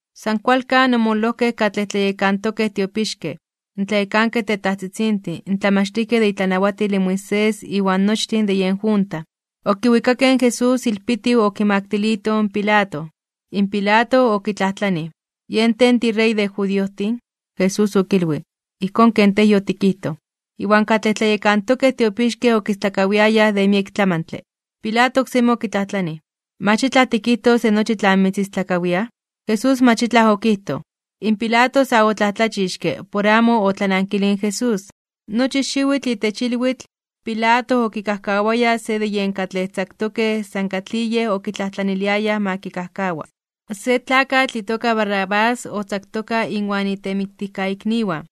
San kualkan, omololojkej katlej tlayekantokej tiopixkej, in tlayekankej tetajtzitzintin, in tlamachtijkej de itlanawatil in Moisés iwan nochtin de yen junta, okiwikakej in Jesús ilpitiw okimaktilitoj in Pilato. In Pilato okitlajtlanij: ―¿Yen tej tiRey de judiojtin? Jesús okilwij: ―Ijkón ken tej yotikijtoj. Iwan katlej tlayekantokej tiopixkej okistlakawiayaj de miek tlamantle. Pilato oksemi okitlajtlanij: ―¿Mach itlaj tikijtos de nochi tlan mitzistlakawiaj? Jesús mach itlaj okijtoj. In Pilato sa otlajtlachixke (omomajmawtij) por amo otlanankilij in Jesús. Nochi xiwitl itech ilwitl, Pilato okikajkawaya se de yen katlej tzaktokej san katlij yej okitlajtlaniliayaj ma kikajkawa. Se tlakatl itoka Barrabás otzaktoka inwan itemiktijikniwan,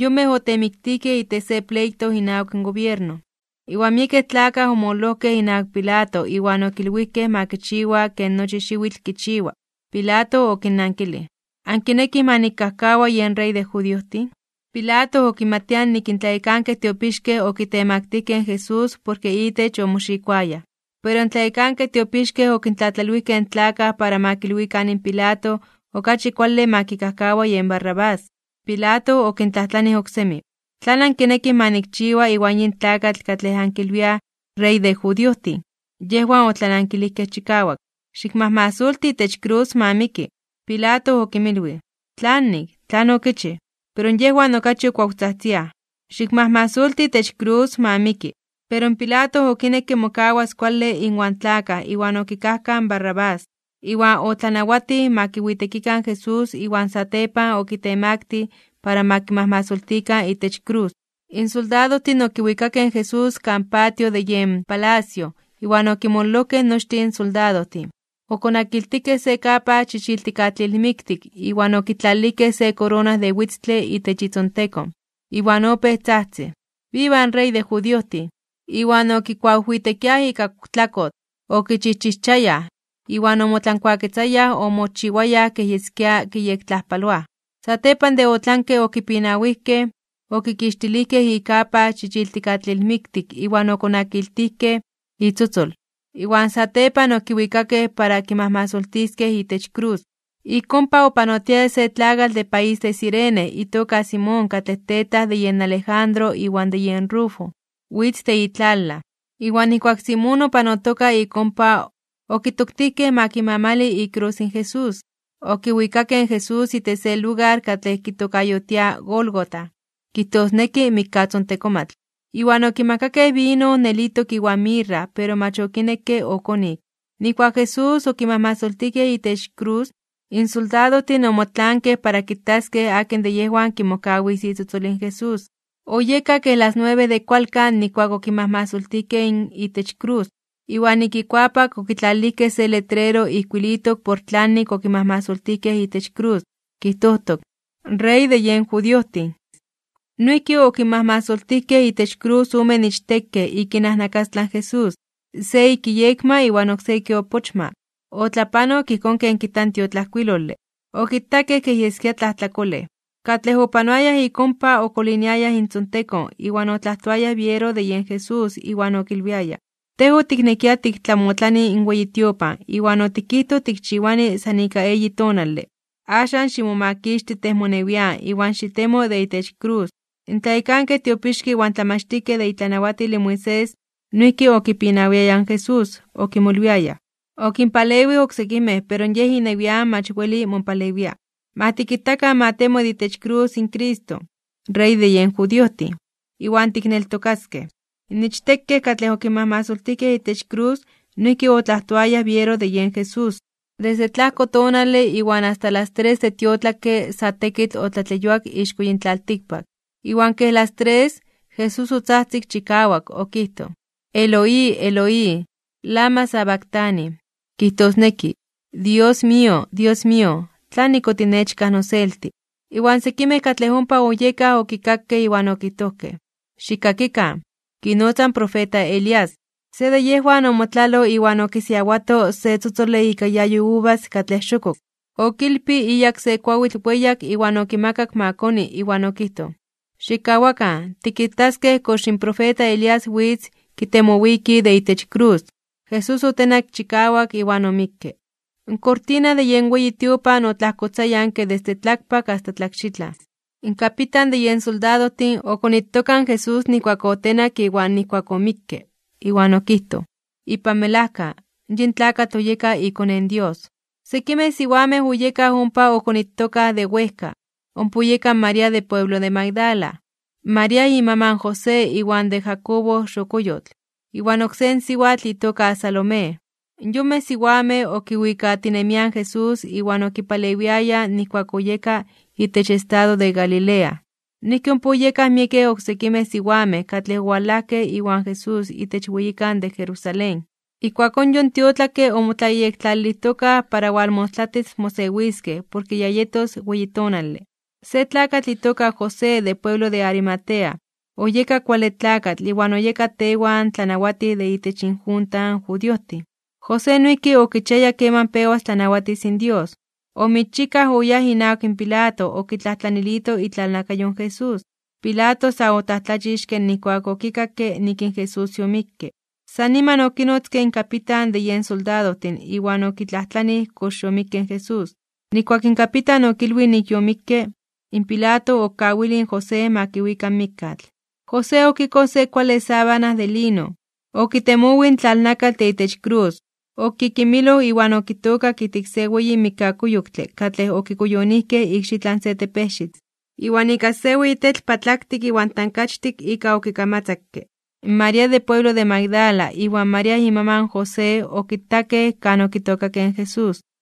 yonmej otemiktijkej itech se pleito inawak gobierno. Iwan miekej tlakaj omololojkej inawak Pilato iwan okilwijkej ma kichiwa ken nochi xiwitl kichiwa. Pilato okinnankilij: ―¿Ankinekij ma nikajkawa yen Rey de judiojtin? Pilato okimatia nik in tlayekankej tiopixkej okitemaktijkej (okitemaktilijkej) in Jesús porke itech omoxikoayaj. Pero in tlayekankej tiopixkej okintlatlalwijkej in tlakaj para ma kilwikan in Pilato okachi kuale ma kikajkawa yen Barrabás. Pilato okintlajtlanij oksemi: ―¿Tlan ankinekij ma nikchiwa iwan yin tlakatl katlej ankilwiaj Rey de judiojtin? Yejwan otlanankilijkej chikawak: ―¡Xikmajmasolti itech krus, ma miki! Pilato okinmilwij: ―¿Tlanik? ¿Tlan okichij? Pero yejwan okachi okuawtzajtziaj: ―¡Xikmajmasolti itech krus, ma miki! Pero in Pilato okinekke mokawas kuale inwan tlakaj iwan okikajkaj in Barrabás. Iwan otlanawatij ma kiwitekikan in Jesús iwan satepan okitemaktij (okitemaktilij) para ma kimajmasoltikan itech krus. In soldadojtin okiwikakej in Jesús kan patio de yen palacio iwan okinmololojkej nochtin in soldadojtin. Okonakiltijkej se kapa chichiltikatlilmiktik iwan okitlalilijkej se korona de witztle itech itzontekon. Iwan opéj tzajtzij: ―¡Viva in Rey de judiojtin! Iwan okikuawijwitekiaj ika tlakotl, okichijchijchayaj, iwan omotlankuaketzayaj omochiwayaj kej yeskia kiyektlajpaloaj. Satepan de otlanke okipinawijkej, okixtilijkej ikapa chichiltikatlilmiktik iwan okonakiltijkej itzotzol, iwan satepan okiwikakej para kimajmasoltiskej itech krus. Ik ompa opanotiaya se tlakatl de país de Cirene itoka Simón katlej tetaj de yen Alejandro iwan de yen Rufo, witz de itlalaj. Iwan nijkuak Simón opanotoka ik ompa, okitoktijkej ma kimamali ikrus in Jesús. Okiwikakej in Jesús itech se lugar katlej kitokayotiaj Gólgota (kijtosneki mikkatzontekomatl). Iwan okimakakej vino nelitok iwan mirra pero mach okinekke okonik. Nijkuak in Jesús okimajmasoltijkej itech krus, in soldadojtin omotlaankej para kitaskej akin de yejwan kimokawis itzotzol in Jesús. Oyeka kej las nuebe de kualkan nijkuak okimajmasoltijkej itech krus. Iwan ik ikuapak okitlalilijkej se letrero ijkuilitok por tlanik okimajmasoltijkej itech krus, kijtojtok: “Rey de yen judiojtin.” Noijki okinmajmasoltijkej itech krus omen ichtekej ik inajnakastlan in Jesús, se ik iyekma iwan oksé ik iopochma. Otlapanok ijkón ken kijta in tiotlajkuilole: “Okitakej kej yeskia tlajtlakolej.” Katlej opanoayaj ik ompa okoliniayaj intzontekon iwan otlajtoayaj biero de yen Jesús iwan okilwiayaj: ―Tej otiknekia tiktlamotlani in weyi tiopan iwan otikijtoj tikchiwani san ika eyi tonale. Axan ximomakixti tej monewian iwan xitemo de itech krus. In tlayekankej tiopixkej iwan tlamachtijkej de itlanawatil in Moisés, noijki okipinawiayaj in Jesús, okimolwiayaj: ―Okinpalewij oksekimej pero yej inewian mach weli mopalewia. Ma tikitakan ma temo de itech krus in Cristo, Rey de yen judiojtin, iwan tikneltokaskej. In ichtekej katlej okinmajmasoltijkej itech krus noijki otlajtoayaj biero de yen Jesús. Desde tlajko tonale iwan asta las tres de tiotlakke sa tekitl otlatleyuak ixko yin tlaltikpak. Iwan kej las tres, Jesús otzajtzik chikawak okijtoj: ―Eloi, Eloi, ¿lama sabactani? ―kijtosneki: Dios mío, Dios mío, ¿tlanik otinechkaj noselti? Iwan sekimej katlej ompa oyekaj okikakej iwan okijtojkej: ―¡Xikkakikan! Kinotza in profeta Elías. Se de yejwan omotlaloj iwan okisiawato se tzotzole ika iayo in uvas katlej xokok. Okilpij iyak se kuawitl weyak iwan okimakak ma koni iwan okijtoj: ―Xikkawakan, tikitaskej kox in profeta Elías witz kitemowiki de itech in krus. Jesús otenak chikawak iwan omikke. In kortina de yen weyi tiopan otlajkotzayanke desde tlakpak asta tlakxitlan. In kapitan de yen soldadojtin, okonitoka in Jesús nijkuak otenak iwan nijkuak omikke, iwan okijtoj: ―Ipan melajka, yin tlakatl oyeka iKone in Dios. Sekimej siwamej oyekaj ompa okonitokaj de wejka, ompa oyeka in María de pueblo de Magdala, María imaman in José iwan de Jacobo xokoyotl, iwan oksé in siwatl itoka Salomé. In yonmej siwamej okiwikatinemiaj in Jesús iwan okipalewiayaj nijkuak oyeka itech estado de Galilea. Noijki ompa oyekaj miekej oksekimej siwamej katlej owalajkej iwan Jesús itech weyikan de Jerusalén. Ijkuakón yon tiotlakke omotlayektlalilijtokaj para walmostlatis mosewiskej porke ya yetos weyi tonale. Se tlakatl itoka José de pueblo de Arimatea, oyeka kuale tlakatl iwan oyeka tewan tlanawatij de itech injunta in judiojtin. José noijki okichiaya keman pewas tlanawatis in Dios. Omixchikaj oyáj inawak Pilato okitlajtlanilito itlalnakayo in Jesús. Pilato sa otlajtlachixke (omomajmawtij) nijkuak okikakke nik in Jesús yomikke. San niman okinotzke in kapitan de yen soldadojtin iwan okitlajtlanij kox yomikke in Jesús. Nijkuak in kapitan okilwij nik yomikke, in Pilato okawilij in José ma kiwika in mikkatl. José okikoj se kuale sábana de lino, okitemowij in tlalnakatl de itech krus, okikimiloj iwan okitookak ijtik se weyi mikkakuyoktle katlej okikuyonijkej ikxitlan se tepejxitl, iwan ika se weyi tetl patlaktik iwan tankachtik ika okikamatzakke. In María de pueblo de Magdala iwan María imaman José okitakej kan okitookakej in Jesús.